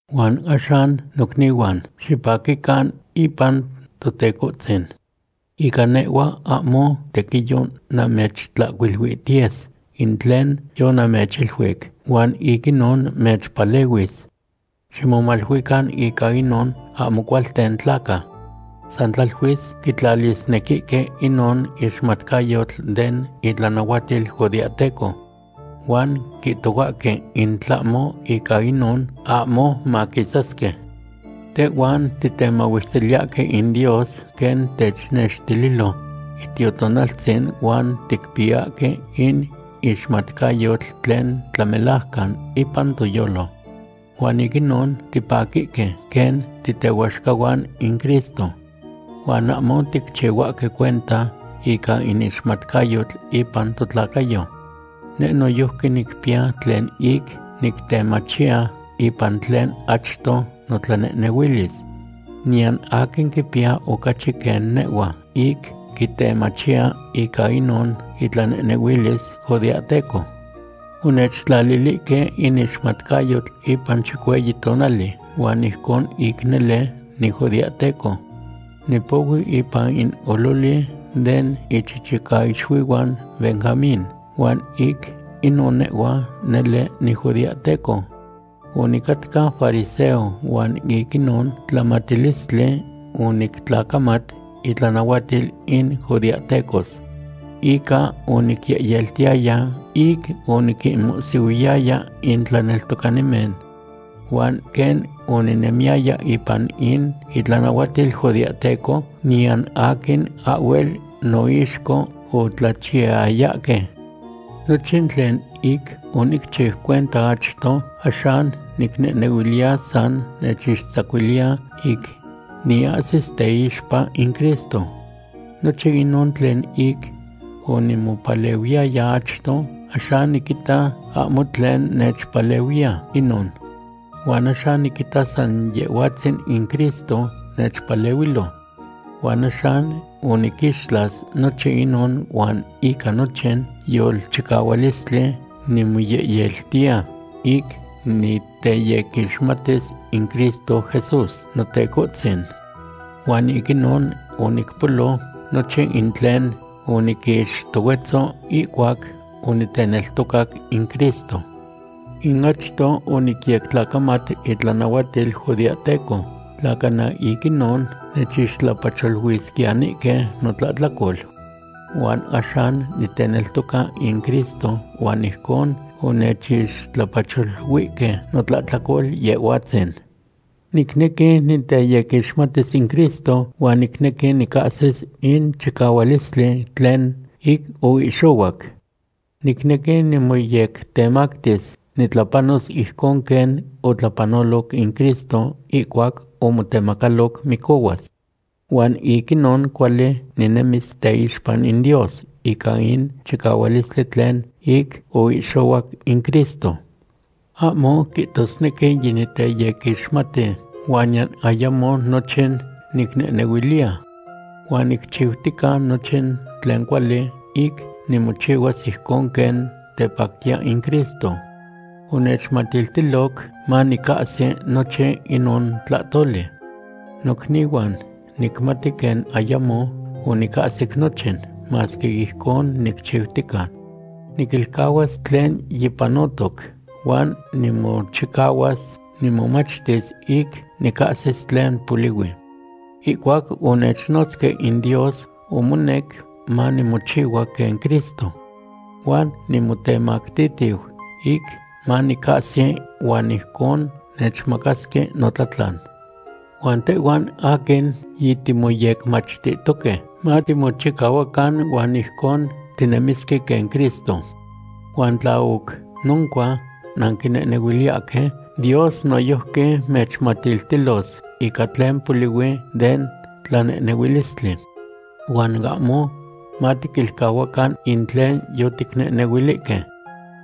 Huan axan, nocnihuan, xipaquican ipan Totecohtzin. Ica nehhua ahmo tequiyo namechihcuiluihtiyes in tlen yonamechiluic, huan ic inon mechpalehuis. Ximomaluican ica inon ahmo cualten tlaca. San tlaluis quitlalisnequihque inon ixmatcayotl den itlanahuatil judeahteco. Huan quihtohuahque in tlahmo ica inon, ahmo maquisasque. Tehhuan titemahuestiliyahque in Dios quen technextililo Itiotonaltzin huan ticpiyahque in ixmatcayotl tlen tlamelajcan ipan toyolo. Huan ic inon tipaquihque quen titehuaxcahuan in Cristo. Huan ahmo ticchihuahque cuenta ica in ixmatcayotl ipan totlacayo. Neh noyojqui nicpiya tlen ic nictemachiya ipan tlen achto notlanehnehuilis. Niyan aquin quipiya ocachi quen nehhua ic quitemachiya ica inon itlanehnehuilis judeahteco. Onechtlalilihque in ixmatcayotl ipan chicueyi tonali, huan ijcon ic nele nijudeahteco. Nipohui ipan in ololi den ichichicaixuihuan Benjamín, huan ic inon nehhua nele nijudeahteco. Onicatca fariseo huan ic inon tlamatilistli onictlacamat itlanahuatil in judeahtecos. Ica onicyehyeltiyaya ic oniquinmohsihuiyaya in tlaneltocanimen. Huan quen oninemiyaya ipan in itlanahuatil judeahteco, niyan aquin ahhuel noixco otlachiyayahque. Nochin tlen ic onicchiu cuenta achto, axan nicnehnehuiliya san nechixtzacuiliya ic niahsis teixpa in Cristo. Nochin inon tlen ic onimopalehuiyaya achto, axan niquita ahmo tlen nechpalehuiya inon. Huan axan niquita san Yehhuatzin in Cristo nechpalehuilo. Huan axan oniquixtlas nochin inon huan ica nochin yolchicahualistli nimoyehyeltiya ic niteyequixmatis in Cristo Jesús, Notecohtzin. Huan ic inon onicpolo nochin in tlen oniquixtohuetzo ihcuac oniteneltocac in Cristo. Ic achto onicyectlacamat itlanahuatil judeahteco, tla cana ic inon nechixtlapacholuisquiyanihque notlahtlacol. Huan axan niteneltoca in Cristo huan ijcon onechixtlapacholuihque notlahtlacol Yehhuatzin. Nicnequi niteyequixmatis in Cristo huan nicnequi nicahsis in chicahualistli tlen ic oihxohuac. Nicnequi nimoyectemactis nitlapanos ijcon quen otlapanoloc in Cristo ihcuac omotemacaloc micohuas. Huan ic inon cuali ninemis teixpa in Dios ica in chicahualistli tlen ic oihxohuac in Cristo. Ahmo quihtosnequi yiniteyequixmati, huan niyan ayamo nochin nicnehnehuiliya. Huan nicchiutica nochin tlen cuali ic nimochihuas ijcon quen tepactiya in Cristo. Onechmatiltiloc manicahsi nochin inon tlahtoli. Nocnihuan, nicmati quen ayamo onicahsic nochin, masque ijcon nicchiutica. Niquilcahuas tlen yipanotoc huan nimochicahuas nimomachtis ic nicahsis tlen polihui. Ihcuac onechnotzque in Dios, omonec manimochihua quen Cristo. Huan nimotemactihtiu ic manicahsi huan ijcon nechmacasque notlatlan. Huan tehhuan aquin yitimoyecmachtihtoque matimochicahuacan huan ijcon tinemisque quen Cristo. Huan tla oc noncua nanquinehnehuiliyahque, Dios noyojqui mechmatiltilos ica tlen polihui den tlanehnehuilistli. Huan ahmo matiquilcahuacan in tlen yoticnehnehuilihque.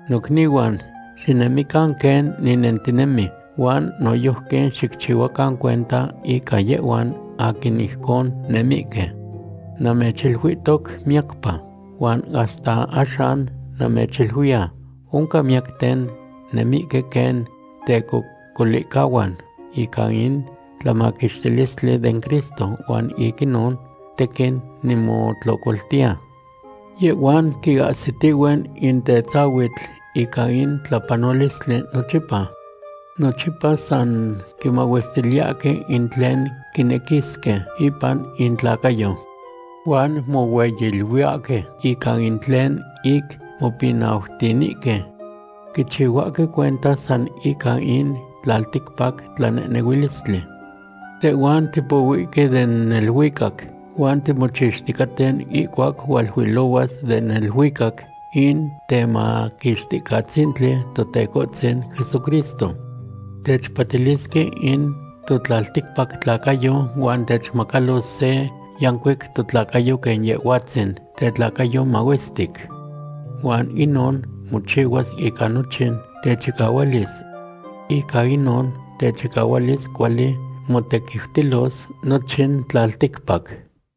Nocnihuan, xinemican quen ninentinemi, huan noyojqui xicchihuacan cuenta ica yehhuan aquin ijcon nemihque. Namechiluihtoc miyacpa, huan hasta axan namechiluiya, oncan miyacten nemihque quen tecocolihcahuan ica in tlamaquixtilistli den Cristo, huan ic inon tequin nimotlocoltiya. Yehhuan quiahsitihue in tetzahuitl ica in tlapanolistli nochipa. Nochipa san quimahuestiliyahque in tlen quinequisque ipan intlacayo. Huan mohueyiluiyahque ica in tlen ic mopinautinihque. Quichihuahque cuenta san ica in tlalticpac tlanehnehuilistli. Tehhuan tipohuihque den neluicac huan timochixticaten ihcuac hualuilohuas den neluicac in Temaquixticatzintli, Totecohtzin Jesucristo. Techpatilisque in totlalticpac tlacayo huan techmacalos se yancuic totlacayo quen Yehhuatzin tetlacayo mahuestic. Huan inon mochihuas ica nochin techicahualis. Ica inon techicahualis cuali motequiutilos nochin tlalticpac.